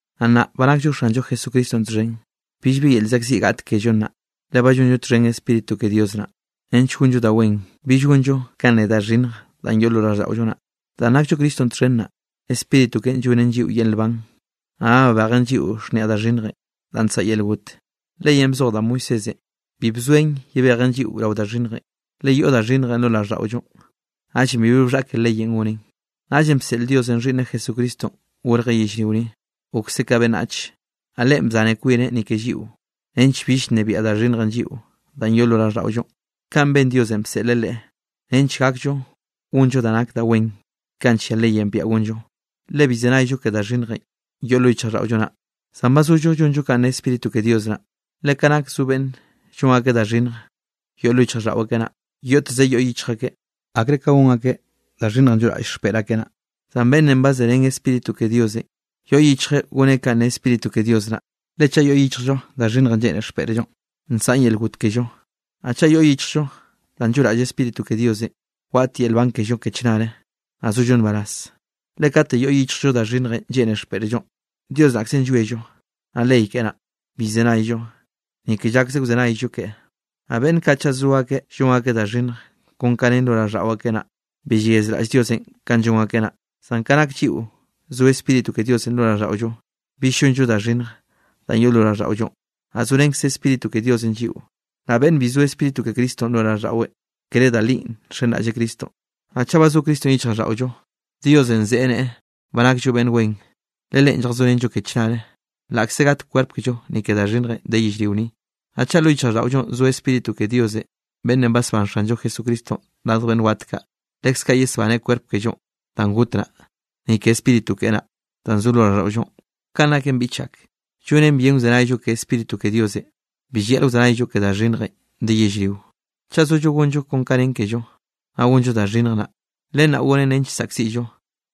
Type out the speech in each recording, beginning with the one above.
Naꞌ nnaꞌ ba nakllo Xanllo Jesucristonꞌ txhen, billbi yel llzaꞌkziꞌ gaꞌt kello nnaꞌ, le ba llonllo txhen Spíritu ke Dios naꞌ, nench gonllo da wen, bill gonllo kanꞌ ne da xhinnjenꞌ danꞌ yoꞌ lo raꞌlldaꞌollo naꞌ. Danꞌ nakllo Cristonꞌ txhen naꞌ, Spíritu keꞌen llonnen lliꞌo yel nban, naꞌ ba babejen lliꞌo xhniaꞌ da xhinnj danꞌ nsaꞌa yel got. Leyenꞌ bzoj da Moisésenꞌ bi bzoen yebejen lliꞌo rao da xhinnjenꞌ, le yoꞌ da xhinnjenꞌ lo raꞌlldaꞌollonꞌ, naꞌllenꞌ bibi bxhaꞌke leyenꞌ gonen. Naꞌllenꞌ bseꞌl Diosenꞌ Xhiꞌnneꞌ Jesucristonꞌ gorjeꞌ yellrio ni, gokseꞌ ka beꞌnnach. Naꞌ Leꞌen bzaneꞌ kwineꞌ ni ke lliꞌo, nench bill nnebiaꞌ da xhinnjenꞌ lliꞌo danꞌ yoꞌ lo raꞌlldaꞌollo. Kaꞌn ben Diosenꞌ bseꞌleꞌ Leꞌe, nench gakllo gonllo ka nak da wen kaꞌ nllia leyenꞌ biaꞌa gonllo. Le bill llzenayllo ke da xhinnjenꞌ yoꞌ yichjraꞌlldaꞌollo naꞌ, zan ba zollo llonllo kon kanꞌ nne Spíritu ke Dios naꞌ. Le ka nak zo beꞌnn llon akeꞌ da xhinnj yoꞌ lo yichjraꞌlldaꞌo akeꞌ naꞌ, yoꞌteze yoꞌ yichj akeꞌ akre ka gon akeꞌ da xhinnjenꞌ lloꞌraꞌll xpeꞌr akeꞌ naꞌ. Zan beꞌnnenꞌ ba zerén Spíritu ke Diosenꞌ, yoꞌ yichjeꞌ goneꞌ kanꞌ ne Spíritu ke Dios naꞌ. Le chaꞌ yoꞌ yichjllo da xhinnjenꞌ lleꞌne xpeꞌrllonꞌ, nsaꞌn yel got kello. Naꞌ chaꞌ yoꞌ yichjllo danꞌ lloꞌraꞌll Spíritu ke Diosenꞌ, waꞌt yel nban kello ke chnare, naꞌ sollo nbaraz. Le kate yoꞌ yichjllo da xhinnjenꞌ lleꞌne xpeꞌrllonꞌ, Dios naꞌkzenꞌ llwiello, naꞌ ley keꞌe naꞌ, bi llzenayllo, ni ke llakse wzenayllo ke. Naꞌ beꞌnn kaꞌ chaꞌ zo akeꞌ llon akeꞌ da xhinnj kon kanꞌ nen lo raꞌlldaꞌo akeꞌ naꞌ, bi yeyazraꞌll Diosenꞌ kanꞌ llon akeꞌ naꞌ. Zan ka nak lliꞌo zo Spíritu ke Diosenꞌ lo raꞌlldaꞌollo, bill llonllo da xhinnj danꞌ yoꞌ lo raꞌlldaꞌollonꞌ, naꞌ zorenkze Spíritu ke Diosenꞌ lliꞌo. Naꞌ beꞌnn bi zo Spíritu ke Cristonꞌ lo raꞌlldaꞌweꞌ, kere da linꞌ nxenraꞌlleꞌ Cristonꞌ. Naꞌ chaꞌ ba zo Cristonꞌ yichjraꞌlldaꞌollo, Diosenꞌ ze neꞌe ba nakllo beꞌnn wen, le Leꞌen lljazorenllo ke chnare, laꞌkze gat kwerp kellonꞌ ni ke da xhinnjenꞌ de yellrio ni. Naꞌ chaꞌ lo yichjraꞌlldaꞌollonꞌ zo Spíritu ke Diosenꞌ beꞌnnenꞌ basbán Xanllo Jesucristonꞌ radj beꞌnn wat kaꞌ, leskaꞌ yesbaneꞌ kwerp kello danꞌ got naꞌ, ni ke Spíritu keꞌe naꞌ, danꞌ zo lo raꞌlldaꞌollonꞌ. Kanꞌ naken, biꞌch ak, llonen bien wzenayllo ke Spíritu ke Diosenꞌ. Bi llayaꞌl wzenayllo ke da xhinnjenꞌ de yellrio. Chaꞌ sollo gonllo kon ka nen kello, naꞌ gonllo da xhinnj naꞌ, len naꞌ gonen nench saꞌkziꞌllo.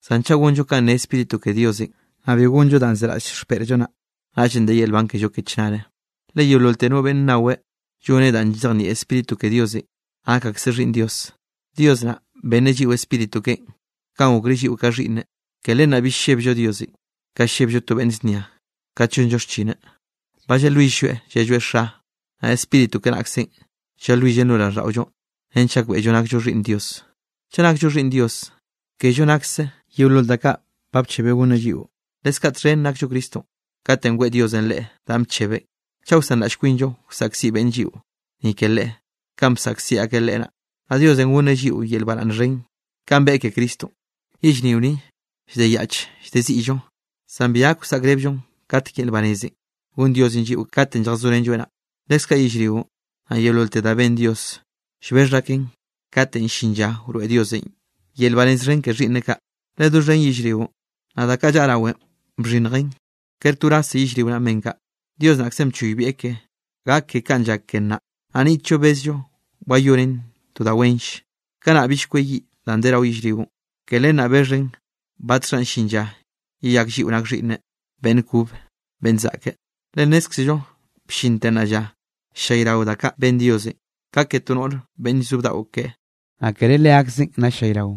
Zan chaꞌ gonllo kanꞌ ne Spíritu ke Diosenꞌ, naꞌ bi gonllo danꞌ zeraꞌll xpeꞌrllo naꞌ, naꞌllenꞌ de yel nban kello ke chnare. Le yeololte no beꞌnn nnaweꞌ lloneꞌ danꞌ llzejnieꞌ Spíritu ke Diosenꞌ, nak akseꞌ xhiꞌnn Dios. Dios naꞌ benneꞌ lliꞌo Spíritu keꞌen kanꞌ gokreꞌ lliꞌo ka xhiꞌnneꞌ. Ke len naꞌ bill llebllo Diosenꞌ ka llebllo to beꞌnn znia kat llonllo xchineꞌ. Ba llalwill-lloeꞌ llelloeꞌ: “Xa”. Naꞌ Spíritu keꞌe naꞌkze llalwillen lo raꞌlldaꞌollo nench gakbeꞌllo nakllo xhiꞌnn Dios. Chaꞌ nakllo xhiꞌnn Dios, kello nakse yeolol da kaꞌ ba bchebeꞌ gonneꞌ lliꞌo, leskaꞌ txhen nakllo Cristonꞌ katenꞌ weꞌe Diosenꞌ Leꞌe danꞌ bchebeꞌn. Chaꞌ wsanraꞌll kwinllo wsaꞌkziꞌ beꞌnn lliꞌo, ni ke Leꞌe, kanꞌ bsaꞌkziꞌ akeꞌ Leꞌe naꞌ, naꞌ Diosenꞌ gonneꞌ lliꞌo yel baraꞌnn xhen, kanꞌ beꞌe ke Cristonꞌ. Yellrio ni llde yaꞌch llde ziꞌllo. Zan bi gak wsaꞌkrebllon katek yel nbarazenꞌ gonn Diosenꞌ lliꞌo katenꞌ lljazorenlloeꞌ naꞌ. Leskaꞌ yellrionꞌ, naꞌ yeololte da ben Dios, llbexh aken katenꞌ llin lla wroeꞌ Diosenꞌ yel banez xhen ke xhiꞌnneꞌ kaꞌ. Le doxhen yellrionꞌ, naꞌ da kaꞌ llaꞌa rawen bxhinnjen; kere to wrazze yellrio naꞌn ben kaꞌ, Dios naꞌkzenꞌ bchoybieꞌ ke, gak ke kanꞌ llak ke nnaꞌ. Naꞌ niꞌtllo bezllo wayoneꞌn to da wenll. Kanaꞌ bill kweyiꞌ danꞌ de rao yellrionꞌ, ke len naꞌ bexhen batxhanꞌ llin lla yeyak lliꞌo nak xhiꞌnneꞌ beꞌnn kobe beꞌnn zaꞌke. Le nnézkzello bllinte nnaꞌ lla, ll-llayrao da kaꞌ ben Diosenꞌ ka ke to noꞌr beꞌnn llzo bdaꞌo keꞌe. Naꞌ kere leakzen naꞌ ll-llayrao,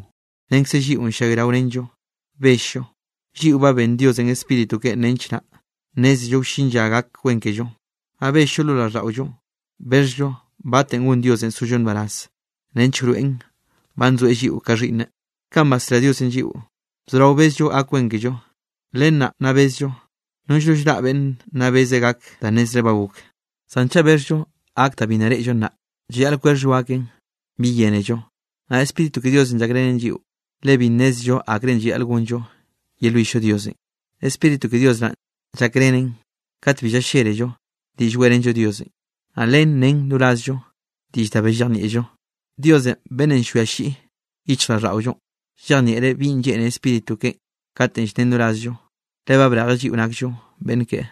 renkze lliꞌon ll-llayraorenllo bell-llo. Lliꞌo ba benn Diosenꞌ Spíritu keꞌen nench naꞌ nnézello wllin lla gak wen kello. Naꞌ bell lo raꞌlldaꞌollo, bexhllo batenꞌ gon Diosenꞌ sollo nbaraz nench wroeꞌn ba nzoeꞌ lliꞌo ka xhiꞌnneꞌ. Kanꞌ basrá Diosenꞌ lliꞌo, bzorao bezllo gak wen kello, len naꞌ nna bezllo. Nono llraꞌ beꞌnn nna beze gak da nnezreꞌ ba gok. Zan chaꞌ bexhllo gak danꞌ bi nna reꞌllo naꞌ, llayaꞌl kwexhllo gaken, bi yénello. Naꞌ Spíritu ke Diosenꞌ llakrenen lliꞌo, le bi nnézello akrenꞌ llayaꞌl gonllo yelwill-llo Diosenꞌ. Spíritu ke Dios naꞌn llakbeꞌren kat bi llallélello diꞌll weꞌrenllo Diosenꞌ, naꞌ len nnen rorazllo diꞌll da bi llejnieꞌllo. Dios beꞌnnenꞌ llwia llyi yichjraꞌlldaꞌollonꞌ, llejnieꞌreꞌ binꞌ lleꞌne Spíritu keꞌen katenꞌ llnnen rorazllo, le ba brejeꞌ lliꞌo nakllo beꞌnn keꞌe.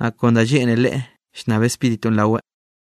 Naꞌ kon da lleꞌne Leꞌe llnnab Spíritunꞌ raweꞌ.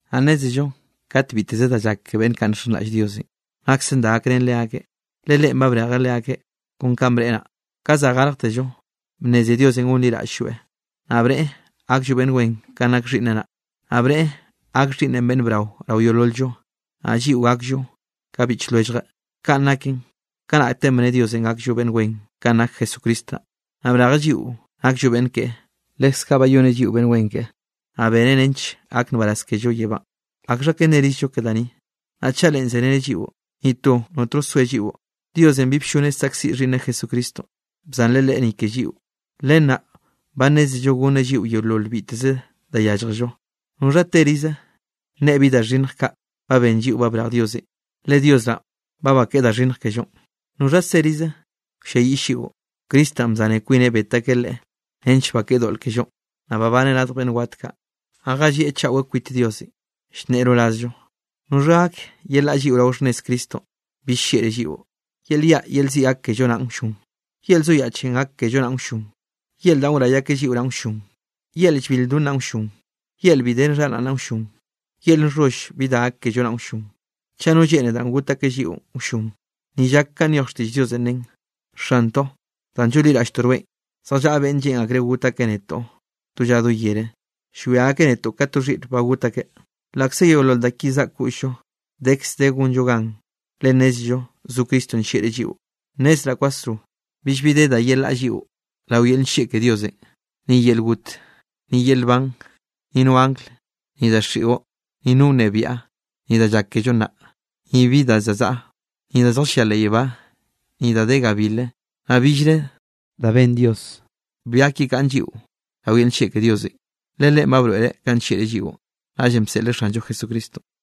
Naꞌ nnézello kat biteze da llak ke beꞌnn kaꞌ nxenraꞌll Diosenꞌ, naksen da gakrén leakeꞌ, le Leꞌen ba brejeꞌ leakeꞌ kon kanꞌ bneꞌe naꞌ. Ka za garjtello, bnneze Diosenꞌ gonliraꞌll-lloeꞌ, naꞌ bneꞌe gakllo beꞌnn wen kanꞌ nak Xhiꞌnneꞌ naꞌ, naꞌ bneꞌe gak Xhiꞌnneꞌn beꞌnn brao rao yeolol-llo, naꞌ lliꞌo gakllo ka biꞌch lwelljeꞌ. Kanꞌ naken, kanaꞌte bne Diosenꞌ gakllo beꞌnn wen kanꞌ nak Jesucristo naꞌ, naꞌ brejeꞌ lliꞌo nakllo beꞌnn keꞌe. Leskaꞌ bayoneꞌ lliꞌo beꞌnn wen keꞌe, naꞌ beneꞌ nench gak nbaraz kello yebánꞌ. ¿Akxha ka nnerizllo ke da ni? Naꞌ chaꞌ Leꞌe zereneꞌ lliꞌo, ni to notno soe lliꞌo. Diosenꞌ bi blloneꞌ saꞌkziꞌ Xhiꞌnneꞌ Jesucristonꞌ, bzanreꞌ Leꞌe ni ke lliꞌo. Len naꞌ ba nnézello gonneꞌ lliꞌo yeolol biteze da yálljello. ¿Noxha terize nne bi da xhinnj kaꞌ ba ben lliꞌo ba brej Diosenꞌ? Le Dios naꞌ ba bakeꞌe da xhinnj kellonꞌ. ¿Noxha serize wlliayiꞌll lliꞌo? Cristo naꞌ bzaneꞌ kwineꞌ bet akeꞌ Leꞌe nench bakeꞌe doꞌl kellonꞌ, naꞌ babaneꞌ radj beꞌnn waꞌt kaꞌ, naꞌ jallieꞌ chaꞌwe kwit Diosenꞌ, llnneꞌe rorazllo. ¿Noxha gak yelaꞌa lliꞌo rao xhnnez Cristonꞌ bill llieꞌreꞌ lliꞌo? ¿Yel yaꞌ yel ziꞌ gak kello naꞌn wllon? ¿Yel zoyaꞌchenꞌ gak kello naꞌn wllon? ¿Yel da wray akeꞌ lliꞌo naꞌn wllon? ¿Yel llbil lldon naꞌn wllon? ¿Yel bi de xharaꞌn naꞌn wllon? ¿Yel nxholl bi da gak kello naꞌn wllon? ¿Chaꞌ no lleꞌne danꞌ got akeꞌ lliꞌon wllon? Ni llak kanꞌ nyoj xtiꞌll Diosenꞌ nen: Xantoꞌ, danꞌ llonliraꞌlltoꞌ rweꞌn, zjallaꞌa beꞌnn lleꞌn akreꞌ got akeꞌ netoꞌ do lla do yere. Llwia akeꞌ netoꞌ ka to xhiꞌr ba got akeꞌ. Laꞌkze yeolol da ki zaꞌk koꞌll-llo, dekz de gonllo gan, le nnézello zo Cristonꞌ nllieꞌreꞌ lliꞌo. Nnezraꞌ kwasro billbi de da yelaꞌa lliꞌo rao yel nllieꞌ ke Diosenꞌ, ni yel got, ni yel nban, ni no angl, ni daxiꞌo, ni no wnebiaꞌ, ni da llak kello nnaꞌ, ni bi da za zaꞌa. Ni da zjallia leꞌ yebá, ni da de gabil, naꞌ billre da ben Dios bi gak yekaꞌn lliꞌo rao yel nllieꞌ ke Diosenꞌ. Le Leꞌen ba broeꞌreꞌ kanꞌ nllieꞌreꞌ lliꞌo, naꞌllenꞌ bseꞌleꞌ Xanllo Jesucristonꞌ.